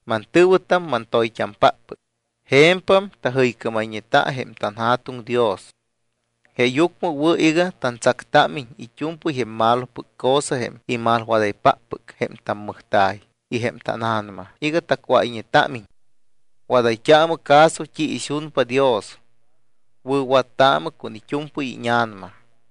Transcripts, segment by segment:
Mantɨ̱wɨtam mantoyt́ampáppɨc, je̱mpam tajɨycámayñeta jém tanJa̱tuŋ Dios. Jeeyucmɨ wɨ̱ iga tantsactámiñ it́u̱mpɨy jém malopɨc cosa jém imalwadaypáppɨc jém tammɨjta̱y y jém tána̱nama iga tacuáyñetámiñ. Wadayt́aamɨ caso t́i ixunpa Dios. Wɨ̱wattaamɨ con it́u̱mpɨy íña̱nama.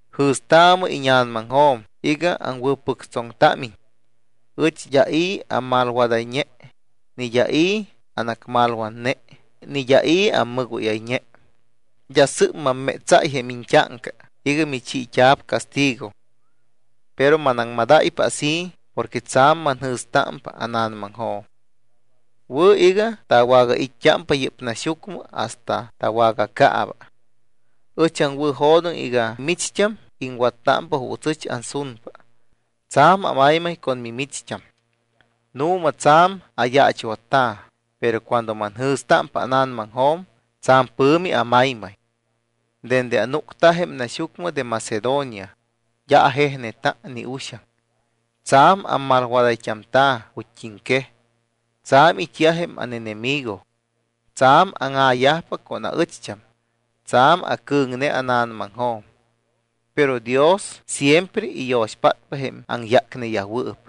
Jɨ̱staamɨ íña̱namaŋjo̱m iga aŋwɨ̱pɨctsoŋtámiñ. Ɨch d́a i̱ ammalwadayñe, ni d́a i̱ anacmalwatne ni d́a i̱ ammɨgóyayñe. D́a sɨ́p mammétsáy jém iñt́áŋca iga michiit́a̱p castigo. Pero manaŋmadáypa así porque tsa̱m manjɨ̱stámpa ána̱namaŋjo̱m. Wɨ̱ iga tawagait́t́ámpa yɨ́p naxyucmɨ hasta tawagacaaba. Ɨch aŋwɨ̱jo̱doŋ iga micht́am iŋwattámpa juuts ɨch ansunpa. Tsa̱m amaymay con mimicht́am. Nu̱ma, tsa̱m ayaachwatta̱, pero cuando manjɨ̱stámpa ána̱namaŋjo̱m, tsa̱m pɨ̱mi amaymay. Dende anúcta jém naxyucmɨ de Macedonia, d́a ajejneta ni uxaŋ. Tsa̱m amalwadayt́amta̱ ju̱t́iŋquej. Tsa̱m it́yaj jém ánenemigo, tsa̱m áŋa̱yajpa con aɨcht́am. Tsa̱m acɨ̱ŋne ána̱namaŋjo̱m. Pero Dios siempre iyo̱xpátpa jém aŋyácneyajwɨɨp,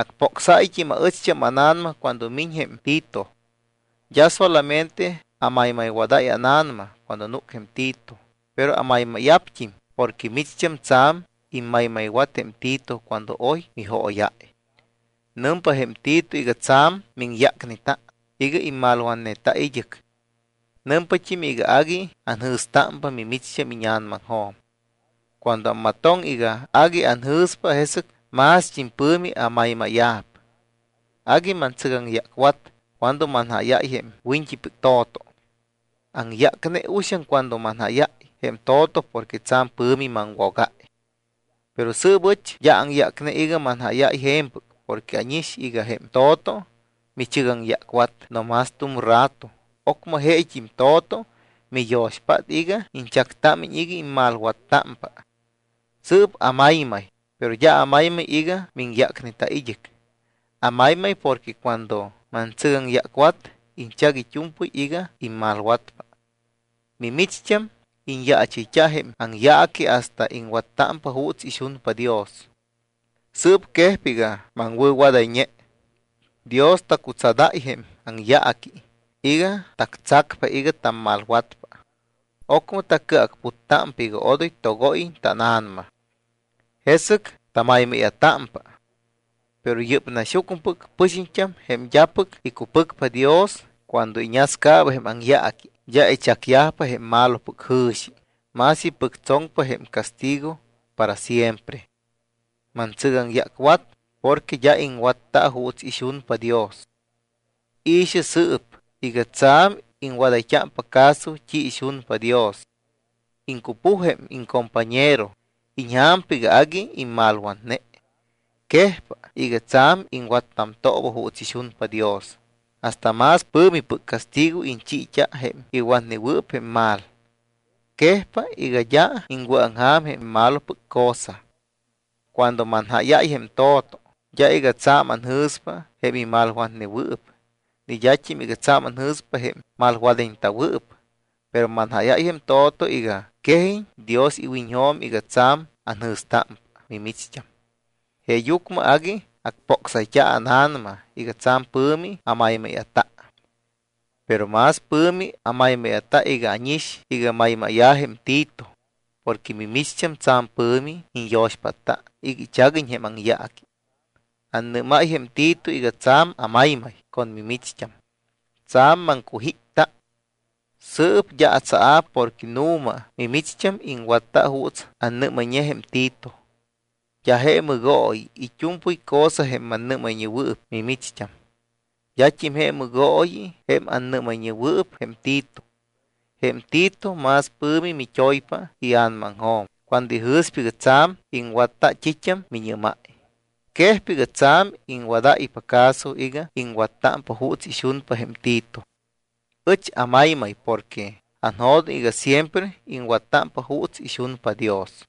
acpocsáyt́im aɨcht́am ána̱nama cuando miñ jém Tito. D́a solamente amaymaywadáy ána̱nama cuando núc jém Tito, pero amaymáya̱pt́im porque micht́am tsa̱m immaymaywat jém Tito cuando oy mijóyáy. Nɨmpa jém Tito iga tsa̱m miŋyácneta iga immalwatneta id́ɨc. Nɨmpat́im iga agui anjɨ̱stámpa mimicht́am íña̱namaŋjo̱m. Cuando ammatoŋ iga agui anjɨ̱spa, jesɨc mást́im pɨ̱mi amaymáya̱p. Agui mantsɨgaŋyácwat cuando manjáyáy jém wiñt́ipɨc to̱to. Aŋyácne uxaŋ cuando manjáyáy jém to̱to porque tsa̱m pɨ̱mi maŋwogáy. Pero sɨɨp ɨch d́a aŋyácne iga manjáyáy je̱mpɨc porque ánix iga jém to̱to michɨgaŋyácwat no más tu̱m rato, ocmɨ jeet́im to̱to miyo̱xpátta iga iñchactámiñ iga immalwattámpa. Sɨɨp amaymay, pero d́a amaymay iga miŋyácneta id́ɨc, amaymay porque cuando mantsɨgaŋyácwat, iñchac it́u̱mpɨy iga immalwatpa. Mimicht́am iñyaachɨyt́a jém aŋyaaqui hasta iŋwattámpa juuts ixunpa Dios. Sɨɨp quejpa iga maŋwɨ̱wadayñe. Dios tacutsadáy jém aŋyaaqui iga tactsacpa iga tammalwatpa. Ocmɨ tacɨacputtámpa iga odoy togóyiñ tána̱nama. Jesɨc tamaymáya̱támpa. Pero yɨ́p naxyucmɨpɨc pɨxiñt́am jém d́apɨc icupɨcpa Dios cuando iñascaaba jém aŋyaaqui, d́a ichacyajpa jém malopɨc jɨ̱xi, más ipɨctsoŋpa jém castigo para siempre. Mantsɨgaŋyácwat porque d́a iŋwatta juuts ixunpa Dios. I̱xɨ sɨɨp iga tsa̱m iŋwadayt́ámpa caso t́i ixunpa Dios. Iŋcupuj jém iŋcompañero, iñja̱mpa iga agui imalwatne. Quejpa iga tsa̱m iŋwattamtooba juuts ixunpa Dios, hasta más pɨ̱mipɨc castigo iñchiit́a jém iwatnewɨɨp jém mal. Quejpa iga d́a iŋwɨ̱aŋja̱m jém malopɨc cosa. Cuando manjáyáy jém to̱to, d́a iga tsa̱m anjɨ̱spa jém imalwatnewɨɨp ni d́at́im iga tsa̱m anjɨ̱spa jém malwadayñeta̱wɨɨp. Pero manjáyáypa jém to̱to iga quejiñ Dios iwiñjo̱m iga tsa̱m anjɨ̱stámpa mimicht́am. Jeeyucmɨ agui acpocsayt́a ána̱nama y tsa̱m pɨ̱mi amaymáya̱ta. Pero más pɨ̱mi amaymáya̱ta iga ánix iga maymáya̱ jém Tito porque mimicht́am tsa̱m pɨ̱mi iñyo̱xpátta iga ichaguiñ jém aŋyaaqui. Annɨ́máy jém Tito iga tsa̱m amaymay con mimicht́am. Tsa̱m maŋcujípta. Sɨɨp d́a atsaa̱p porque nu̱ma mimicht́am iŋwatta juuts annɨ́mayñe jém Tito. D́a je mɨgooyi it́u̱mpɨy cosa jém mannɨ́mayñewɨɨp mimicht́am. D́at́im je mɨgooyi jém annɨ́mayñewɨɨp jém Tito. Jém Tito más pɨ̱mi mit́oypa ia̱namaŋjo̱m cuando ijɨ̱spa iga tsa̱m iŋwatta t́it́am miñɨ́máy. Quejpa iga tsa̱m iŋwadáypa caso iga iŋwattámpa juuts ixunpa jém Tito. Ɨch amaymay porque anjo̱doŋ iga siempre iŋwattámpa juuts ixunpa Dios.